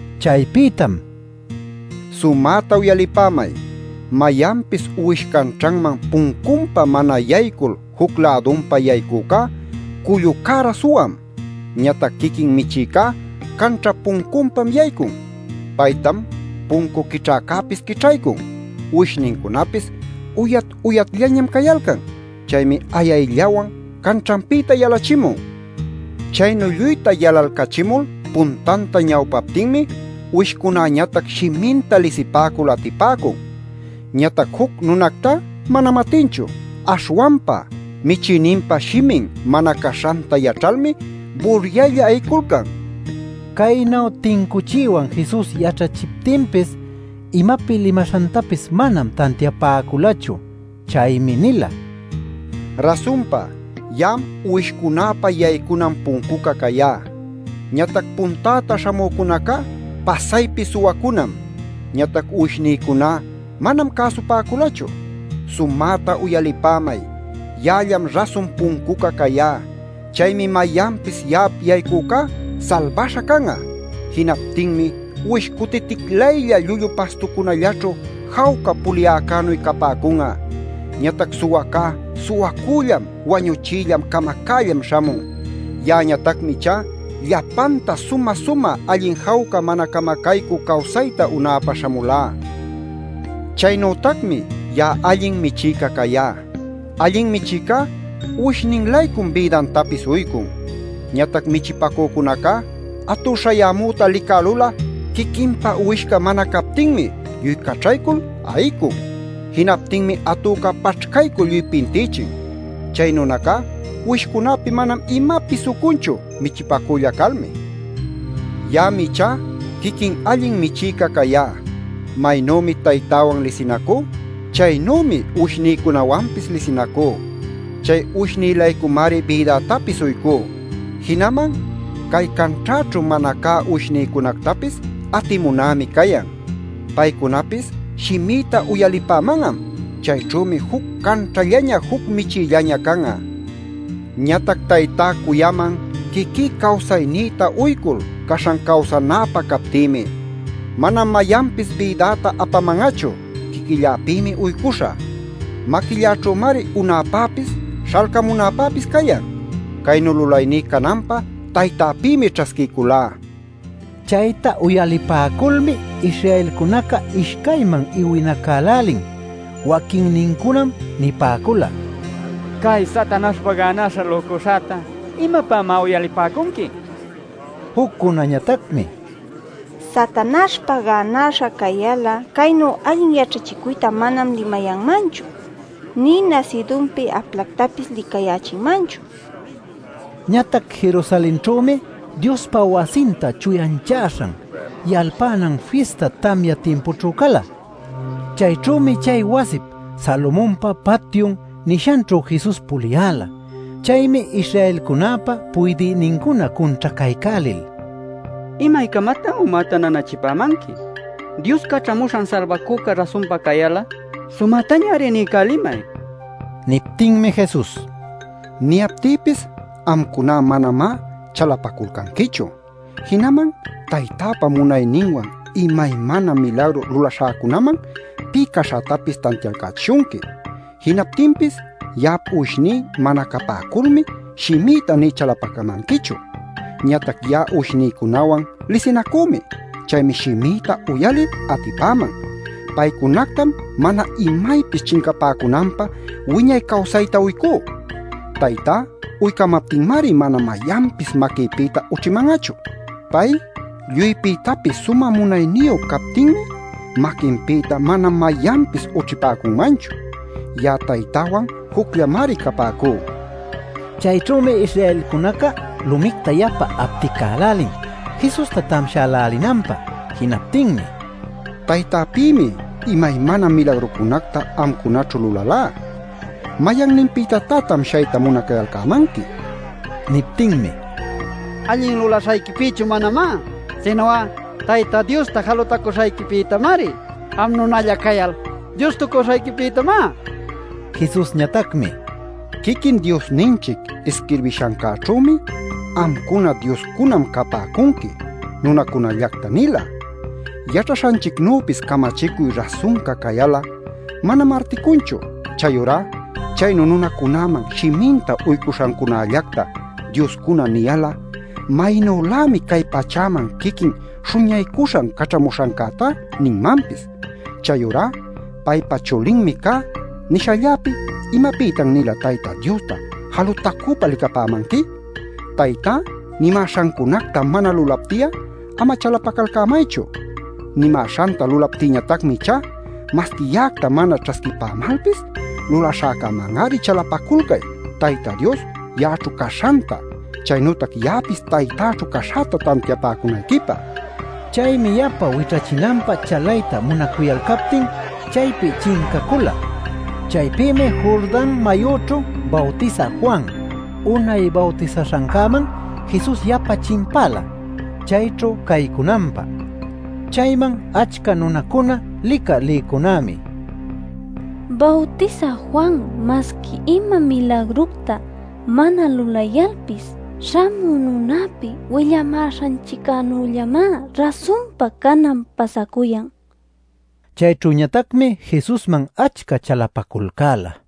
Chaypïtam: “Sumäta uyalipämay: mayanpis uwish canćhaman puncunpa mana yaycul juc-lädunpa yaycücá cullu cära suwam. Ñatac quiquin michïcá canćhap puncunpam yaycun. Paytam puncu quićhäcäpis quićhaycun. Uwishnincunapis uyat-uyatllañam cayalcan. Chaymi ayayllawan canćhanpïta yalachimun. Chaynu lluyta yalalcachimul puntanta ñawpaptinmi uwishcunäñatac shiminta lisipäcul atipäcun. Ñatac juc nunactá manam atinchu. Aśhwanpa michïninpa shimin mana caśhanta yaćhalmi buryaylla ayiculcan” nin. Caynu tincuchiywan Jesus yaćhachiptinpis imapi limaśhantapis manam tantiapäculachu. Chaymi nila: “Rasunpa ya'am uwishcunäpa yaycunan puncuca cayá. Ñatac puntäta śhamücunacá pasaypi suwacunam. Ñatac uwishnïcuná manam cäsupäculachu. Sumäta uyalipämay: ya'allam rasun puncuca cayá. Chaymi mayanpis ya'ap yaycücá salbaśha can'a. Jinaptinmi uwish cutiticlaylla llullu pastucunalläćhu jawca puliycänuy capäcun'a. Ñatac suwacá suwacüllam wañuchïllam camacällam śhamun. Ya'añatacmi ichá llapanta sumä-sumä allin jawca mana camacaycü cawsayta unäpä śhamulá. “Chaynütacmi ya'a allin michïca cayá. Allin michïcá uwishnin-laycum bïdantapis uycun. Ñatac michipacücunacá atü śhayämüta licälul'a quiquinpa uwishca mana captinmi lluy caćhaycul ayicun. Jinaptinmi atüca paćhcaycul lluy pintïchin. Chay nunacá uwishcunäpi mana imapis ucunchu michipacülla calmi. “Ya'am ichá quiquin allin michïca cayá. Maynümi Taytäwan lisinacú, chaynümi uwishnïcunawanpis lisinacú. Chay uwishnï-laycumari bïdätapis uycú. Jinaman cay canćhäćhu mana cä uwishnïcunactapis atimunämi cayan. Paycunapis shimïta uyalipäman'am. Chayćhümi juc canćhallaña juc michïllaña can'a. “Ñatac Taytá cuyaman quiquí cawsaynïta uycul caśhan cawsanäpä captïmi. Manam mayanpis bïdäta apaman'achu; quiquilläpïmi uycuśhä. Maquilläćhümari unäpäpis, śhalcamunäpäpis cayan. Caynu lulayní cananpä Taytäpïmi ćhasquiyculá” nil. Chayta uyalipäculmi Israelcunaca ishcayman iwinacälälin. Waquinnincunam nipäcula: “Cay'a Satanaśhpa gänaśha lücuśhäta ¿imapämá uyalipäcunqui?” nil. Juccunañatacmi: “Satanaśhpa gänäśha cayal'a caynu allin yaćhachicuyta manam limayanmanchu, nï nasïdunpi aplactapis licayächinmanchu” nipäcula. Ñatac Jerusalenćhümi Diospa Wasinta Chuyanchaśhan Yalpanan Fista tamya timpućhu cala. Chayćhümi chay wasip “Salomonpa Patyun” nishanćhu Jesus puliyäla. Chaymi Israelcunäpa puydïnincuna cunćhacaycälil: “¿Imaycamatan umäta nanachipämanqui? Dios Caćhamuśhan Salbacüca rasunpa cayal'a, ¡sumätañari niycälimay!” nin. Niptinmi Jesus: “Niyaptïpis amcuna manamá chalapaculcanquichu. Jinaman Taytäpa munayninwan imaymana milagru lulaśhäcunam pï caśhätapis tantialcächishunqui. Jinaptinpis ya'ap uwishní mana capäculmi shimïta nï chalapacamanquichu. Ñatac ya'a uwishnïcunawan lisinacümi. Chaymi shimïta uyalil atipäman. Paycunactam mana imaypis chincapäcunanpä wiñay cawsayta uycú. Taytá uycayämaptinmari mana mayanpis maquïpïta ućhiman'achu. Pay lluypïtapis sumä munayniyu cayaptinmi maquinpïta mana mayanpis ućhipäcunmanchu. Ya'a Taytäwan jucllamari capäcú” nin. Chayćhümi Israelcunaca lumicta yapa apticälälin Jesusta tamshälälinanpä Jinaptinmi: “Taytäpïmi imaymana milagrucunacta amcunaćhu lulalá. ¿Mayanninpïtatá tamshayta munacayalcämanqui?” nin. Niptinmi: “¡Allin lulaśhayquipïchu manamá, sinu'a Tayta Diosta jalutacuśhayquipïtamari! ¡Am nunalla cayal Diostucuśhayquipïtamá!” nicuyalcan. Jesusñatacmi: “Quiquin Diosninchic isquirbishancäćhümi ‘Amcuna dioscunam capäcunqui’ nunacunallacta nila. Yaćhaśhanchicnüpis camachicuy rasunca cayal'a, manam articunchu. Chayurá chaynu nunacunäman shiminta uycuśhancunällacta ‘dioscuna’ niyal'a, maynülämi cay pachäman quiquin Śhuñaycuśhan Caćhamuśhancätá ninmanpis. Chayurá ‘Paypa chulinmi cá’ nishalläpi ¿imapïtan-nila Tayta Diosta jalutacüpa licapämanqui? Taytá nimäśhancunacta mana lulapti'a ama chalapacalcämaychu. Nimäśhanta lulaptïñatacmi ichá, masqui ya'acta mana ćhasquipämalpis lulaśhäcäman-ari chalapaculcay Tayta Dios ya'aćhu caśhanta, chaynütac ya'apis Taytäćhu caśhäta tantiapäcunayquipä” nin. Chaymi yapa wićhachinanpä chalayta munacuyalcaptin chaypi chincacula. Chaypïmi Jordan mayüćhu Bawtisä Juan unay bawtisaśhancäman Jesus yapa chimpala chayćhu caycunanpä. Chayman achca nunacuna licä lïcunämi: “Bawtisä Juan masqui ima milagructa mana lulayalpis, śhamü nunapi willamäśhanchiccänüllamá rasunpa canan pasacuyan” nipäcula. Chayćhüñatacmi Jesusman achca chalapaculcäla.